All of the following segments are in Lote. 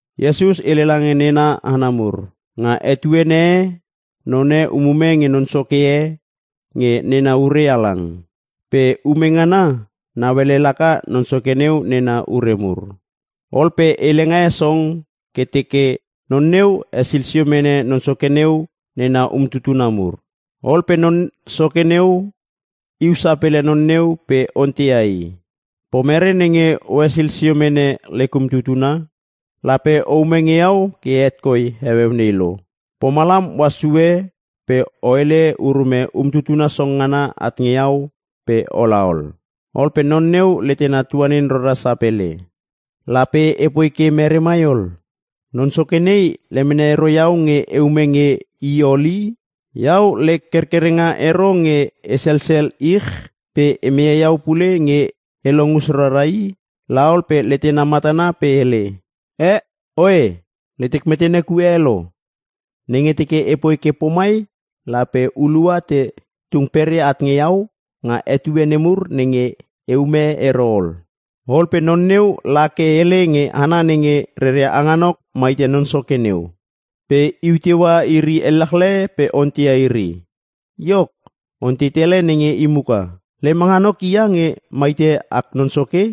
Iesus hele lange nena hana mur, “Nga etuene e, none umume nge non soke e nge nena ure halang. Pe ume ngana nauelele laka non soke neu nena ure mur. Ol pe helenga e song ke teke non neu hesil sio mene non soke neu nena umtutuna mur. Ol pe non soke neu iu sapele non neu pe onteia i, ‘Pomere nenge ohesil sio mene lek umtutuna? Lape o ume nge iau ke het koi heueu lo. Pomalam ohas sue pe o hele urume umtutuna song ngana at nge iau pe ola ol.’ “Ol pe non neu letena tuanin rara sapele, ‘Lape epoi ke mere mai ol? Non soke nei lemene ero iau nge eume nge i ol i! Iau lek kerkerenga ero nge e sesel ich pe e meia iau pule nge e long us rara i!’ La ol pe letena matana pe hele, ‘Eh! Oe, letek metene kue e lo! Nenge teke epoi ke pomai lape hulua te tung peria at nge iau nga etue nemur nenge e ume ero ol.’ “Ol pe non neu la ke hele nge hana nenge reria hanganok maite non soke neu. Pe iu teua iri elechle pe onteia iri. Iok, ontei tele nenge i muka, ‘Lem hanganok hia nenge maite ak non soke?’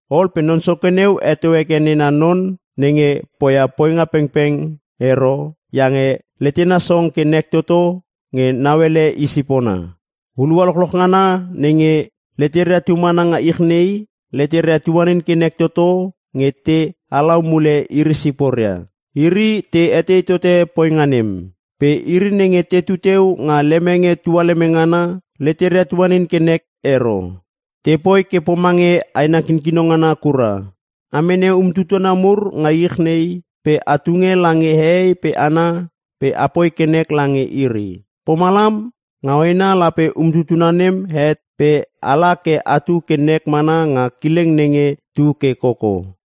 “Ol pe non soke neu heto heke nena non nenge na poinga pengpeng ero, iange letena song ke nek toto nge nauele i sipona. Hulua lochloch ngana nenge leteria tu mana nga ich nei, leteria tuanin ke nek toto nge te halau mule iri siporia. Iri te etei tote poinga nem. Pe iri nenge tetu teu nga lemenge tualeme ngana, leteria tuanin ke nek ero. Te poi ke pomange aina kinkino ngana kura. A mene umtutuna mur nga ich nei pe a tunge lange hehei pe hana pe apoi ke nek lange iri. Pomalam nga hoena lape umtutuna nem het pe ala ke atu ke nek mana nga kileng nenge tu ke koko.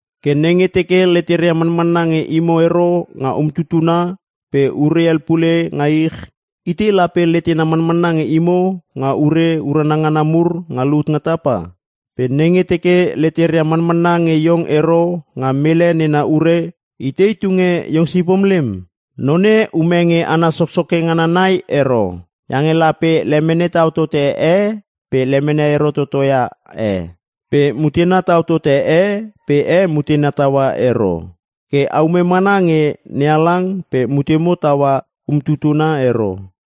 Ke nenge teke leteria manmana nge imo ero nga umtutuna pe ure hel pule nga ich, itei lape letena manmana nge imo nga ure urana ngana mur nga lut nga tapa? Pe nenge teke leteria manmanna nge iong ero nga mele nena ure lape itei tunge iong sipom lem? “Non e ume nge hana soksoke ngana nai ero. Iange lape lemene tau tote e pe lemene ero totoia e. Pe mutena tau tote e pe e mutena taua ero. Ke aume mana nge NeHalang pe mutemo taua umtutuna ero.”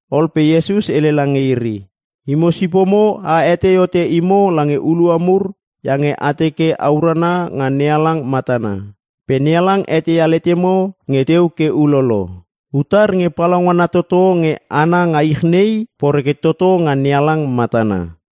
Ol pe Iesus hele lange iri, “Imo sipomo a hetei hote imo lange hulua mur iange a teke a urana nga NeHalang matana. Pe NeHalang eteia letemo nge teu ke ulolo. Utar nge palaungana toto nge hana nga ich nei poreke toto nga NeHalang matana.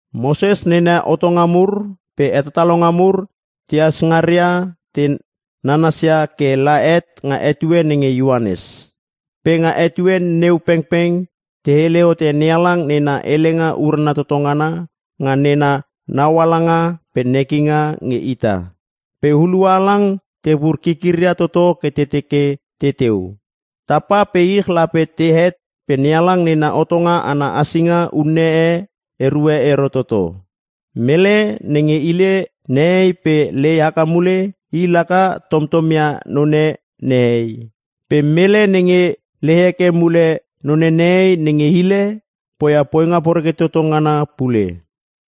“Moses nena hotonga mur pe hetatalonga mur tehas ngaria te nanasia ke la het nga etue nenge Ioanes. Pe nga etue neu pengpeng te hele hote NeHalang nena helenga urana toto ngana nga nena naualanga pe nekinga nge ita. Pe hulua halang tepur kikiria toto ke teke teteu. Tapa pe ich lape tehet pe NeHalang Nena Hotonga ana hasinga unne e erue ero toto. “Mele nenge hile nehei pe lei haka mule i laka tomtom ia none nehei. Pe mele nenge lei heke mule none nehei nge hile poia poinga poreke toto ngana pule.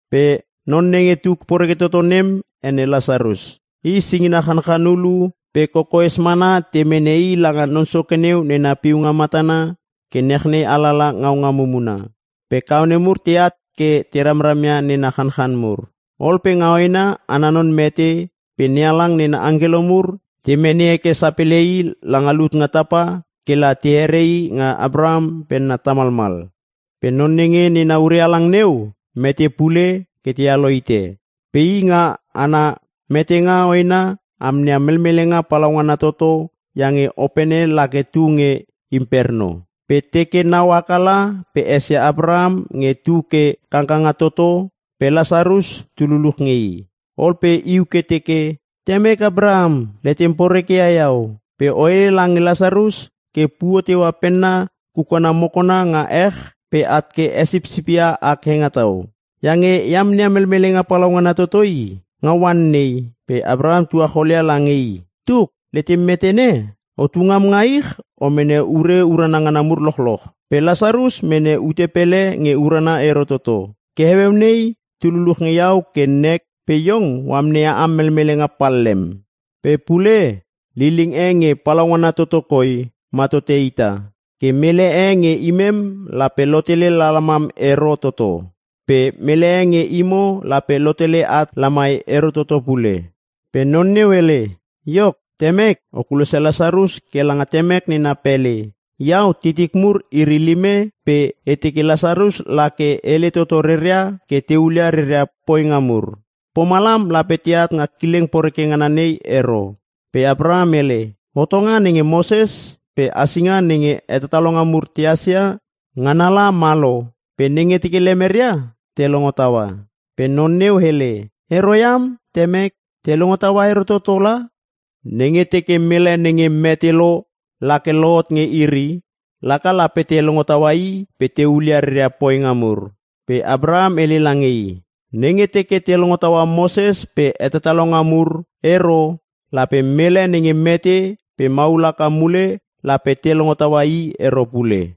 Pe non nenge tu poreke toto nem ene Lasarus. I singina chanchan hulu pe kokoes mana te mene i langa non soke neu nena piunga matana ke nachnei alala ngaunga mumuna. Pe kaone mur teat ke te ramram ia nena chanchan mur. “Ol pe nga hoena ana non mete pe NeHalang nena angkelo mur te mene heke sapele i langa lut nga tapa ke la are nga Apraham penna tamalmal. Pe non nenge nena ure halang neu mete pule ke tealo hite. Pe i nga ana metenga hoena amneia melmelenga palaungana toto iange opene lake tu nge imperno. Pe teke nau haka la pe esia Apraham nge tu ke kangkanga toto pe Lasarus tu luluch nge i. Ol pe iu ke teke, ‘Temek, Apraham letem poreke ia iau, pe o hele lange Lasarus ke puo teua penna kukana mokona nga ech pe at ke hesipsipia ak hengetau. Iange e amneia melmelenga palaungana toto i, nga oan nei.’ “Pe Apraham tuacholia lange i, ‘Tuk, letem metene? Otu ngam nga ich, o mene ure urana ngana mur lochloch. Pe Lasarus mene ute pele nge urana ero toto. Ke heueu nei tu luluch nge iau ke nek pe iong o amneia am melmelenga pallem. Pe pule liling e nge palaungana toto koi ma tote ita. Ke mele e nge imem lape lotele lalamam ero toto. Pe mele e nge imo lape lotele at lamai ero toto pule.’ “Pe non neu hele, ‘Iok temek, o kulosia Lasarus ke langa temek nena pele. Iau titik mur iri lime pe e teke Lasarus la ke hele toto reria ke te hulia reria poinga mur. Pomalam lape teat nga kileng poreke ngana nei ero.’ “Pe Apraham hele, ‘Hotonga nenge Moses pe hasinga nenge hetatalonga mur tehas ia ngana la ma lo. Pe nenge teke lemeria te longo taua.’ “Pe non neu hele, ‘Ero iam, Temek! Te longo taua ero toto la! Nenge teke mele nenge mete lo lake lohot nge iri, laka lape te longo taua i pe te hulia reria poinga mur.’ “Pe Apraham hele lange i, ‘Nenge teke te longo taua Moses pe hetatalonga mur ero lape mele nenge mete pe mahul haka mule lape te longo taua i ero pule.’”